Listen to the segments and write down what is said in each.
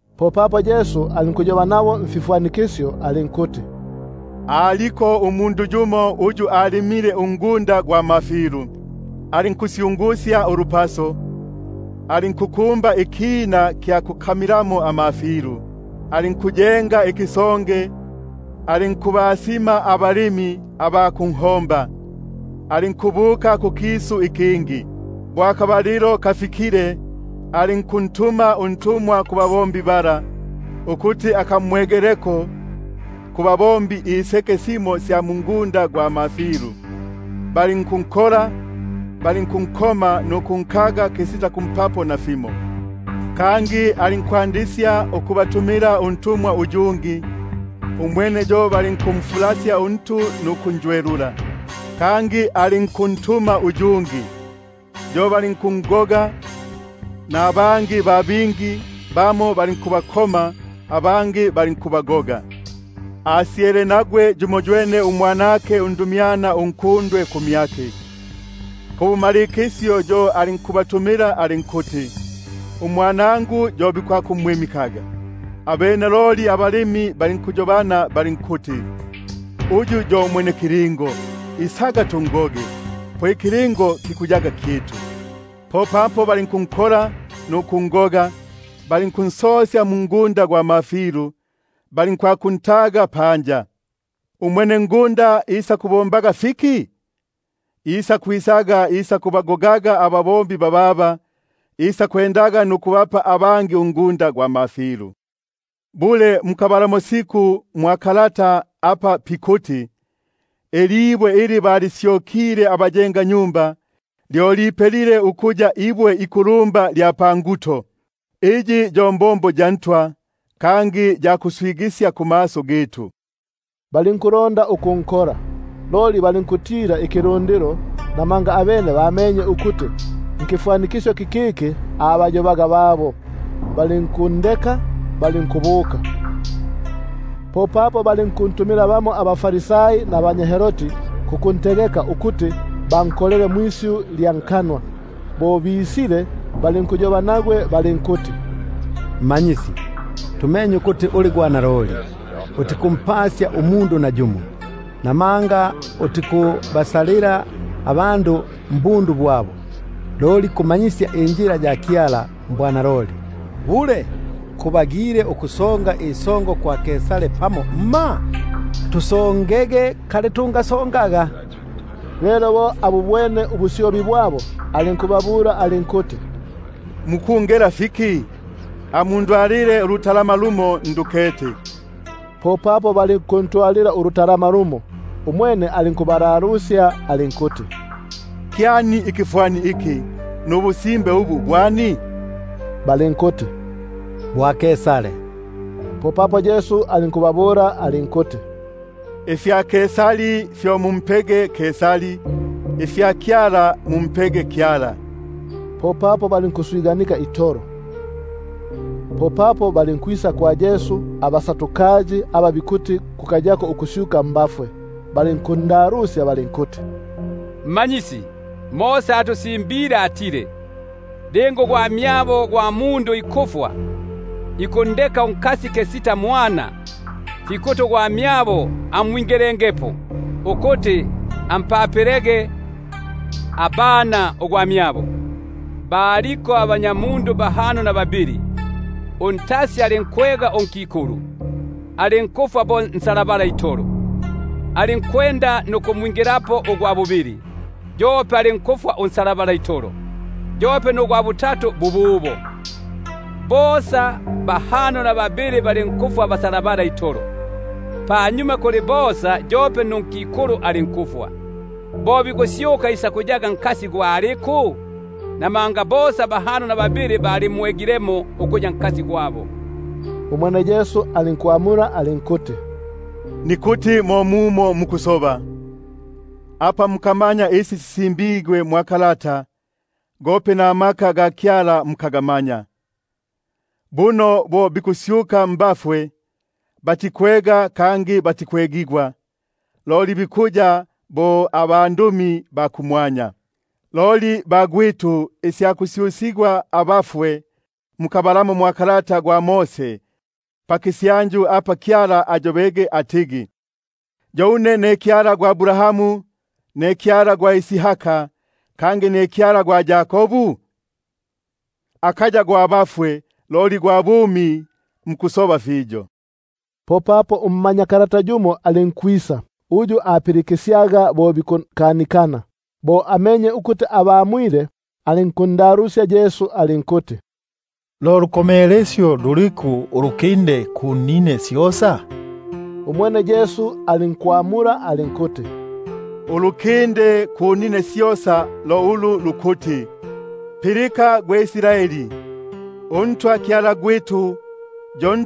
Popapo alinkwanda ukuyoba nabo mfifwanikisyo alinkuti: Umundu alimile ungunda gwa mafilu, alinkusyungusya ulupaso, alinkukumba ikina kya kukamilamo amafilu, alinkuyenga ikisonge,#ikisonge, bamo bikuti ingasya. alinkubasima abalimi aba kunho- mba, alinkubuka kukisu ikingi. Lelo bo akabalilo kafikile, alinkuntuma untumwa kubalimi bala, ukuti akamwegeleko kubalimi iseke simo sya mungunda gwa mafilu. Balinkunkola, balinkunkoma nukunkaga kisita kumpapo nafimo. Kangi alinkwandisya ukubatumila untumwa uyungi, umwene yo balinkuntika untu nukunjwelula. Kangi alinkuntuma uyungi, yo balinkungoga; nabangi ba bingi, bamo balinku- bakoma, abangi balinkubagoga. Asyele nagwe yumoywene, umwanake undumyana unkundwe kumyake; pabumalikisyo yo alinkubatumila alinkuti: Umwanangu yo bisakumwimi- kaga. Abene loli abalimi balinkuyobana balinkuti: Uyu yo mwenekilingo, isaga tungoge, po ikilingo kikuyaga kyitu. Popapo balinkunkola nukungoga, balinkunsosya mungunda gwa mafilu, balinkwakuntaga panja. Isakubombaga fiki umwenengunda? Isakwisaga nukubagoga abalimi bababa, ende nukubapa abangi ungunda gwa mafilu. Mukabalamo siku mwa kalata apa pikuti: Ilibwe ili balisyokile abayengi, Lyo lipelile ukuya ibwe ikulumba lya panguto; Iyi yo mbombo ya Ntwa, Kangi ya kuswigisya kumaso gitu? Balinkulonda ukunkola, loli balinkukitila ikilundilo, papo bamenye ukuti nkifwanikisyo kikiki abayobaga babo. Balinkundeka balinkubuka. Popapo balinkuntumila bamo abaFarisai pamopene nabanya Herodi, ukuti bankolele ilisyu lya nkanwa. Bo bislie, balinkuyoba nagwe balinkuti: Mmanyisi, tumenye ukuti uli gwa naloli, utikumpasya umundu, namanga utikubasalila abandu mbundu bwabo, loli kumanyisya injila ya Kyala mbwanaloli. Bule, kubagile ukusonga isongo kwa Kaisari pamo mma? Tusongege kali tungasongaga? Lelo bo abubwene ubusyobi bwabo alinkubabula alinkuti: Mukungela fiki? Amundwalile denari yumo ngete. Popapo balinkutwala yumo. Umwene alinkubalalusya alinkuti: Kyani ikifwani iki, nubusimbe ubu hwani? Balinkuti: Kya Kaisari. Popapo Yesu alinkubabula alinkuti: Ifya Kaisari fyo mumpege Kaisari, ifya Kyala mumpege Kyala. Popapo balinkuswiganika itolo. Popapo balinkwisa kumyake abaSadukai, aba bikuti kuka- yako ukusyuka mbafwe, balinkundalusya balinkuti: Mmanyisi, Mose atusimbile atile: Linga ugwamyabo gwa mundu ikufwa, ikundeka unkasi kisita mwana, fikuti ugwamyabo amwingilengepo, ukuti ampapilege abana ugwamyabo. Baliko abanyamundu bahano na babili. Untasi alinkwega unkikulu, alinkufwa bo nsalabala itolo; alinkwenda nukumwingilapo ugwa bubili, yope alinkufwa unsalabala itolo; nugwa butatu bububo; bosa bahano na babili balinkufwa abasalabala itolo. Kunyuma kuli bosa yope nunkikulu alinkufwa. Bo bikusyuka, isakuyaga nkasi gwa aliku? Buno bosa bahano na babili balimwegile ukuya nkasi gwabo. Umwene Yesu alinkubamula alinkuti: Mukaya mo mumo mukusoba, apa mukamanya isi sisimbigwe mwa kalata, gope namaka ga Kyala mukagamanya? Buno bo bikusyuka mbafwe, batikwega kangi batikwegigwa, loli bikuya bo abandumi ba kumwanya. Loli isya kusyusigwa mbafwe, mukabalamo mwa kalata gwa Mose, pakisyanju apa Kyala ayobege atigi: Yo une ne Kyala gwa Abrahamu, Kyala gwa Isaka, kangi ne Kyala gwa Yakobu? Akaya yo Kyala gwa bafwe, loli gwa bumi. Mukusoba fiyo. Popapo ummanyakalata yumo alinkwisa, uyu apilikisyaga bo bikukanikana. Bo amenye ukuti abamwile kanunu, alinkundalusya alinkuti: Lo lukomelesyo luliku ulukinde kunine syosa? Umwene Yesu alinkwamula alinkuti: Ulukinde lo ulu lukuti: Pilika gwe Israeli, uNtwa Kyala gwitu yo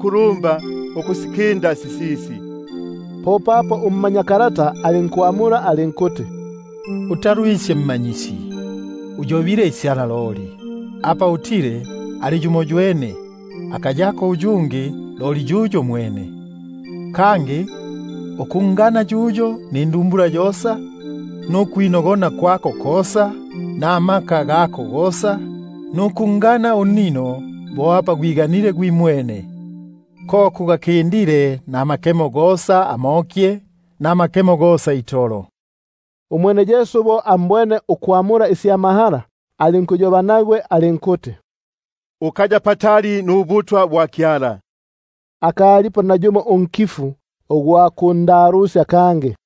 lumba ukusikinda sisisi. Popapo ummanyakalata alinkumbula alinkuti: Utalwisye Mmanyisi, uyobile isya naloli ukuti ali yumoywene, akayako uyungi loli yuyo mwene; kangi ukungana yuyo nindumbula yosa, nukwinogona kwako kosa, namaka gako gosa, nukungana unnino bo apa gwiganile gwimwene, ko kugakindile namakemo gosa amokye, namakemo gosa itolo. Umwene Yesu bo ambwene ukwamula isya mahala, alinkuyoba nagwe alinkuti: Ukaya patali nubutwa bwa Kyala. Akalipo nayumo unkifu ugwa kundalusya kangi.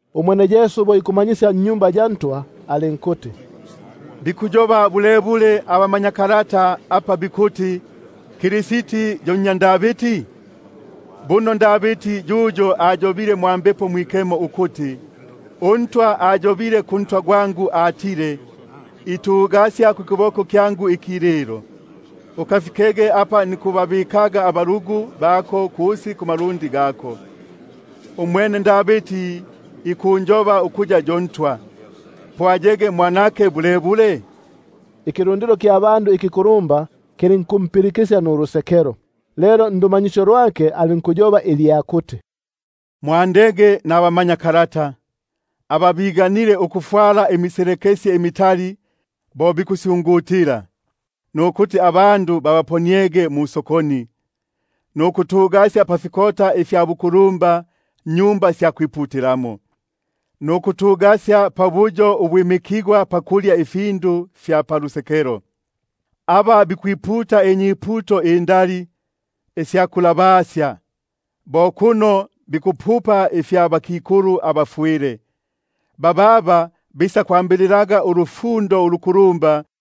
Umwene Yesu bo ikumanyisya mwa Tempeli, alinkuti: Bikuyoba bulebule abamanyakalata apa bikuti Kristi yo nnya Davidi? Buno Davidi yuyo ayobile mwa Mbepo Mwikemo ukuti: UNtwa ayobile kuNtwa gwangu atile: Itugasya kukiboko kyangu ikililo, Ukafikege apa nikubabikaga abalugu bako kusi kumalundi gako. Umwene Davidi ikunjoba ukuya yo Ntwa, po ayege mwanake bulebule? Ikilundilo kya bandu ikikulumba kilinkumpilika nulusekelo. Lelo ndumanyisyo lwake alinkuyoba ilya kuti: Mwandege nabamanyakalata, aba biganile ukufwala imiselekesye imitali bo bikusyungutila, nukuti abandu babaponiege musokoni, nukutugasya pafikota fya bukulumba mmaSinagogi, nukutugasya pabuyo ubwimikigwa pakulya ifindu fya palusekelo; aba bikwiputa inyuputo indali isya kulabasya, bo kuno bikulya inyumba sya bakikulu abafwile; bababa bisakwambililaga ulufundo ulukulumbapo.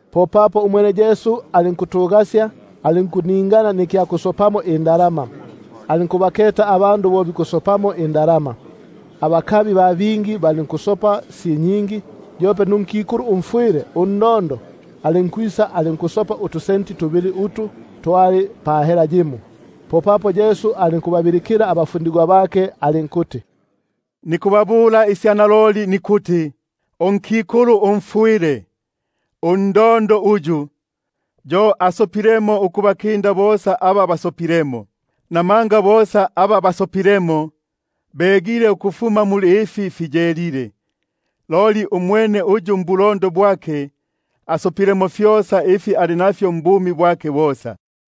Popapo umwene alinkutugasya alinkuningana nikya kusopelamo indalama, alinkukiketa ikilundilo bo ikusopamo indalama. Abakabi ba bingi balinkusopamo si nyingi. Yope nunikulu yumo umfwile, undondo, alinkwisa alinkuso- pamo utusenti tubili utu tuli pa hela yimo. Popapo alinkubabiliila abafundigwa bake alinkubabula alinkuti: Naloli nikubabula une nikuti, unikulu umfwile, undondo uyu, yo asopilemo ukubainda bosa aba basopilemo, buno bosa aba basopilemo, begile ukufuma muli ifi fiyelile, loli umwene uyu mbulondo bwake, asopilemo fyosa ifi ali nafyo mbumi bwake bosa.